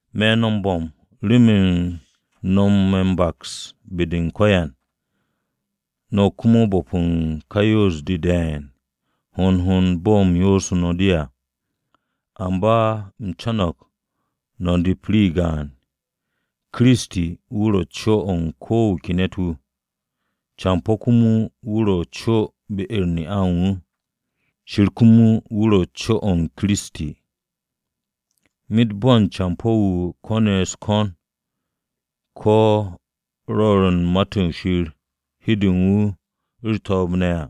Me̱ no̱ m-bo̱m remen no̱ me̱ m-baks be-de u̱n ko̱yan, no̱ komo m-bo̱p u̱n ka yoos-de de̱e̱n, hond hond bo̱ u̱m yoosu̱ no̱ de à. Amba u̱m co̱no̱g no̱ nep rii gaan: Kiristi wu̱ ro̱ co-o̱ u̱n ko wu̱ ke ne̱t-wu̱, campo̱ komo wu̱ ro̱ co be-u̱r ne'a u̱n wu̱, Shir komo o̱ ro̱ co Kiristi. Myet bo̱n campo̱-wu̱ ko̱ne̱ u̱s-ko̱n ko̱ rwo̱r u̱n Ma-to̱ Shir hin de u̱n wu̱ ro̱ u̱r-to̱o̱b ne̱ à,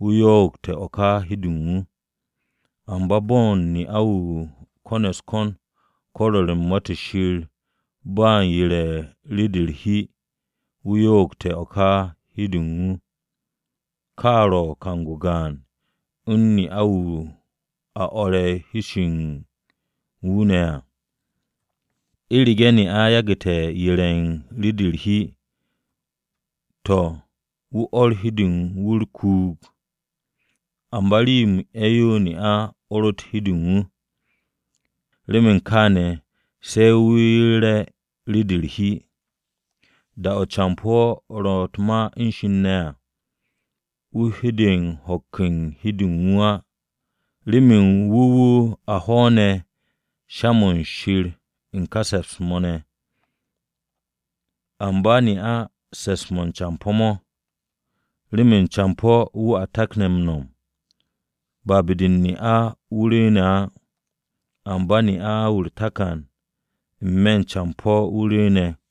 wu̱ yo'ogte̱ o̱ ka hi-de u̱n wu̱. Amba bo̱n ne'a-wu̱ ko̱ne̱ u̱s-ko̱n ko̱ rwo̱r u̱n Ma-to̱ Shir ba u̱n yere̱ u̱n rii-de u̱r-hi, wu̱ yo'ogte̱ o̱ ka hi-de u̱n wu̱, ka ro̱ kang-o gaan u̱n ne'a-wu̱ a o̱re̱ shi-se̱ u̱n wu̱ ne̱ à. U̱rege̱ ne'a yagu̱te̱ yere̱ u̱n rii-de u̱r-hi, to̱, wu̱ or hi-de u̱n wu̱ u̱r-kuug. Amba rii-yo m-'e̱ yo ne'a or hi-de u̱n wu̱, remen kaane̱ se wu̱ yere̱ rii-de u̱r-hi. Da-o̱ campo̱ ro̱ u̱t-ma u̱n Shir ne̱ à, wu̱ hede ho̱k u̱n hi-de u̱n wu̱ á, remen wu̱ wu̱ a hwo̱o̱ne̱ sha-mo̱ Shir u̱n ká se̱ps-mo̱ ne̱. Amba ne'a se̱ps-mo̱ u̱n campo̱ mo̱. Remen campo̱ wu̱ a takne̱ m-no̱m, ba be-de u̱n ne'a-wu̱ rwu̱u̱ne̱ á. Amba ne'a-wu̱ u̱r-takan, n-me̱ u̱n campo̱-wu̱ rwu̱u̱ne̱.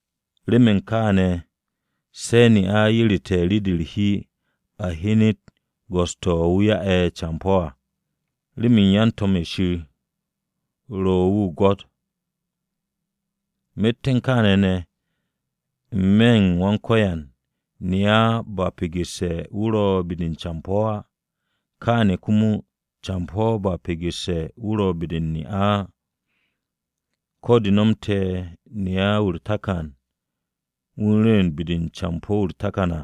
Remen kaane̱ se̱ ne'a yerete̱ rii-de u̱r-hi a hyenet go̱s-to̱ wu̱ ya'e̱ campo̱ à, remen yan-to̱m-ye̱ Shir ro̱ wu̱ m-gwo̱t. Myet u̱n kaane̱ ne̱, n-me̱ u̱n Wan-Ko̱yan, ne'a ba pegesse̱ wu̱ ro̱ be-de u̱n campo̱ á. Kaane̱ komo, campo̱ ba pegesse̱ wu̱ ro̱ be-de u̱n ne'a á. Ko̱ de nomte̱ ne'a-wu̱ u̱r-takan wu̱ u̱n rwu̱u̱n be-de u̱n campo̱-wu̱ u̱r-takan à,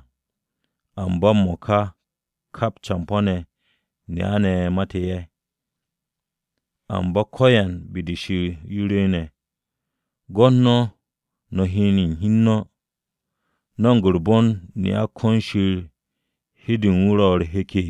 amba m-mo̱ka, kap campo̱-ne̱, ne'a-ne̱ mate̱ ye̱, amba ko̱yan be-de Shir yo rwu̱u̱ne̱. Gwo̱t no̱ no̱ hyen u̱n hi u̱n no̱, ¿no̱mo̱g u̱r-bon ne'a kon Shir hi-de u̱n wu̱ ro̱ u̱r-hek?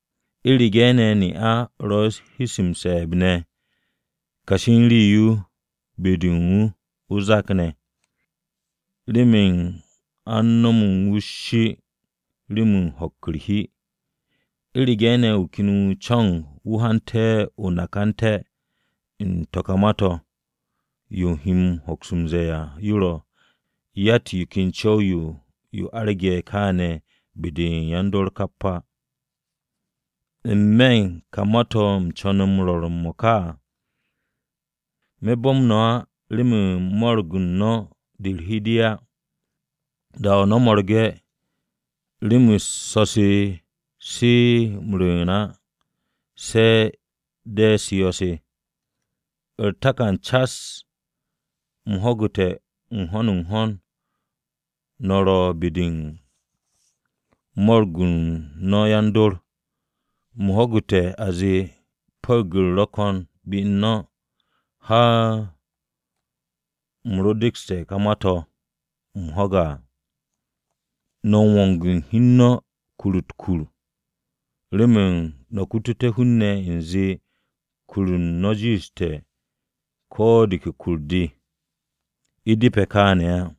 U̱rege̱ ne̱ ne'a ro̱ u̱n hi-se m-se̱e̱b ne̱ kashi u̱n rii-yo be-de u̱n wu̱ o-zak ne̱, remen a u̱n nomo wu̱ u̱s-shi remen ho̱k u̱r-hi. U̱rege̱ ne̱ wu̱ ken wu̱ co̱no̱g hante̱ o-nakante̱ u̱n to̱ ka ma-to̱, yo u̱m he hoks m-ze̱e̱ à yo ro̱, yatt yo ken co̱w-yo yo arge̱ kaane̱ be-de yan-dor kap á. N-me̱ u̱n ka ma-to̱ u̱m co̱ne̱ m-rwo̱r m-mo̱ka à. Me̱ bo̱m no̱ á remen mo̱ro̱g u̱n no̱ de u̱r-hi de á. Da-o̱ no̱ mo̱rge̱, rem-u̱s so̱-se ro̱ m-rwu̱u̱n á se de̱ rem-u̱s yo̱-se. U̱r-takan cas, u̱m ho̱gu̱te̱ n-ho̱n n-ho̱n no̱ ro be-de u̱n mo̱ro̱g-u̱r no̱ yan-dor, u̱m ho̱gu̱te̱ a zee pu̱ru̱g-u̱r ro̱ ko̱n be u̱n no̱, har u̱m ro dekste̱ to̱ ken ma-to̱ u̱m ho̱ge̱ à. No̱ m-wong u̱n hi u̱n no̱ kur-u̱t u̱t-kur remen no̱ kututé̱ hun-ne̱ u̱nze kur u̱n no̱ jiishte̱ ko̱ de ke kur-de. U̱ depe̱ kaane̱ á.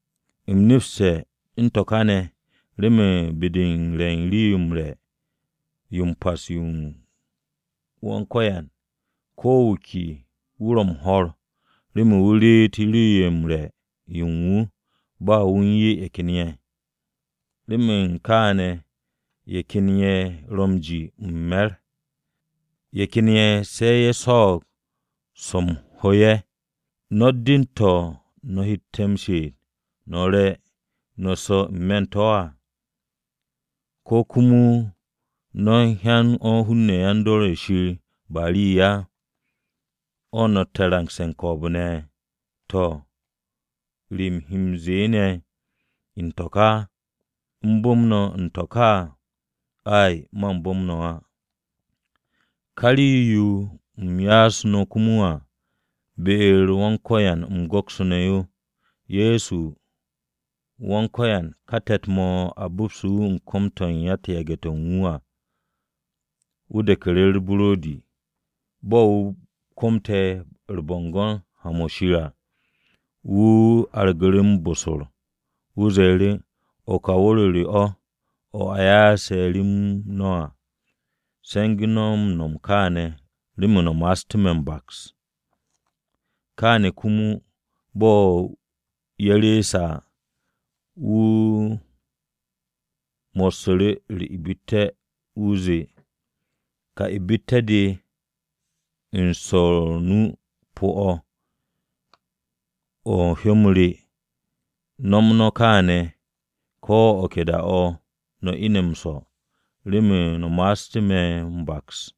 U̱m nepste̱ u̱n to̱ ka ne̱ remen be-de u̱n re̱ u̱n Rii-yo m-re̱ yo m-Pas yo u̱n Wan-Ko̱yan, ko̱ wu̱ ke wu̱ ro̱ m-ho̱r remen wu̱ reet rii-yo m-re̱ yo u̱n wu̱ ba wu̱ u̱n 'ya ye̱ ken ye̱. Remen u̱n kaane̱ ye̱ ken ye̱ ro̱ m-ji m-me̱r, ye̱ ken ye̱ ne̱ se̱ ye̱ swo̱o̱g swo̱-m ho ye̱. ¿No̱tt den-to̱ no̱ hette̱ m-she'et no̱ re no̱ su̱ n-me̱ to̱ á? ¿Ko̱ komo no̱ u̱n hyan o̱ hun-ne̱ yan-dor ye̱ Shir ba rii á, o̱ no̱tte̱ u̱n rangse̱ u̱n ko̱o̱b-ne̱? To̱, ¿re u̱m he no̱ m-ze̱e̱ ne̱ u̱n to̱ ka? ¿U̱m bu̱m no̱ u̱n to̱ ka? Ay, man bu̱m no̱ á. Ka rii-yo u̱m ya'asu̱ no̱ komo à, be-u̱r Wan-Ko̱yan u̱m go̱ksu̱ne̱ yo. Ye̱so Wan-Ko̱yan ká te̱t-mo̱ a bo̱psu̱tu̱ wu̱ u̱n kom-to̱ u̱n yan-yage̱-to̱ u̱n wu̱ à, wu̱ de̱ku̱ru̱ u̱r-buro̱di. Bo̱ wu̱ komte̱ u̱r-bo̱ngo̱n ha-mo̱ Shir à, wu̱ argu̱ m-bosor, wu̱ zee, “O̱ ka wu̱r-o re o̱, o̱ a ya'ase̱ rem no̱ à. Se̱ngu̱ no̱ m-no̱m kàane̱ remen no̱ ma'astú̱ me̱ m-baks.” Kaane̱ komo bo̱ ye̱ reese̱ à, wu̱ mossu̱ru̱ u̱r-ibitte̱ wu̱ ze̱e̱, “Ka ibitte̱-de swo̱r o-nu pu̱-o̱, o̱ u̱n hyó-m re. No̱m no̱ kàane̱ ko̱ o̱ ke da-o̱ no̱ ine̱ m-swo̱, remen no̱ ma'astú̱ me̱ m-baks.”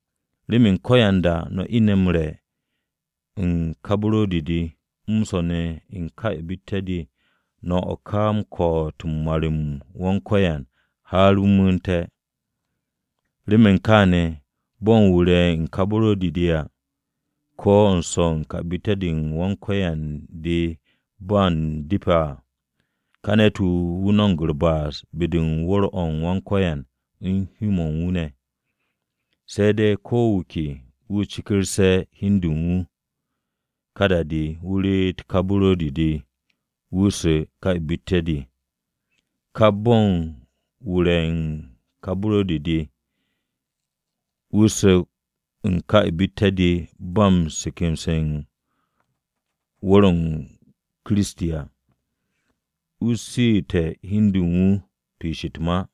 Remen ko̱yanda no̱ ine̱ re̱ u̱n ka buro̱di-de, m-swo̱ ne̱ u̱n ka ibitte̱-de no̱ o̱ ká u̱n ko̱'o̱t u̱n mar-m Wan-Ko̱yan har wu̱ mu̱u̱nte̱. Remen kaane̱ bo̱n wu̱ re̱ u̱n ká buro̱di-de à, ko̱ wu̱ swo̱ u̱n ká ibitte̱-u̱r Wan-Ko̱yan de ba m-depe̱ à, ka ne̱t-wu̱ wu̱ no̱mo̱g u̱r-ba'as be-de u̱n wu̱r-o Wan-Ko̱yan u̱n hyó-mo̱ u̱n wu̱ ne̱. Se̱ de̱ ko wu̱ ke wu̱ cekerse̱ hi u̱n du u̱n wu̱, ká da-de wu̱ reet ká buro̱di-de wu̱ su̱ u̱n ka ibitte̱-de. Kap bo̱n wu̱ re̱ ká buro̱di-de, wu̱ su̱ u̱n ká ibitte̱-de ba m-se̱ke̱mse̱ u̱n wu̱r-o Kiristi à, wu̱ su̱u̱te̱ hi u̱n du u̱n wu̱ piish u̱t-ma.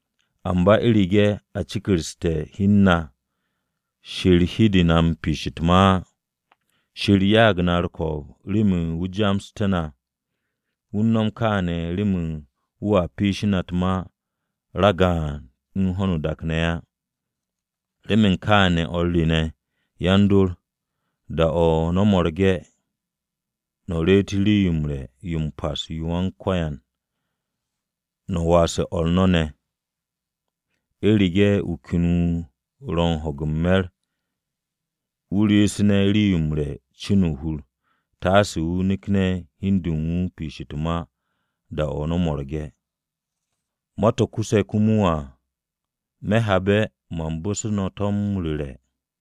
Amba u̱rege̱ a cekersu̱te̱ hi u̱n na, Shir hede na piishe̱ u̱t-ma á. Wan-Ko̱yan ya'ag na u̱r-ko̱o̱b remen wu̱ ja'asté̱ na. Wu̱ u̱n nom kaane̱ remen wu̱a piishí na u̱t-ma ragaan u̱n ho̱no o-dak ne̱ á. Remen kaane̱ o̱r re ne̱, yan-dor, da-o̱ no̱ mo̱rge̱ no̱ reet Rii-yo m-re̱ yo m-Pas yo u̱n Wan-Ko̱yan no̱ waase̱ o̱r no̱ ne̱. U̱rege̱ ne̱ wu̱ ken wu̱ ro̱ u̱n ho̱ge̱ u̱n me̱r wu̱ reesu̱ne̱ rii-yo m-re̱ cin o-hur, taase wu̱ nekne̱ hi u̱n de u̱n wu̱ piish-de u̱t-ma da-o̱ no̱ mo̱rge̱. Ma-to̱ kuse̱ komo à me̱ habe̱ man bu̱se̱ no̱ to̱ m-ru̱re̱.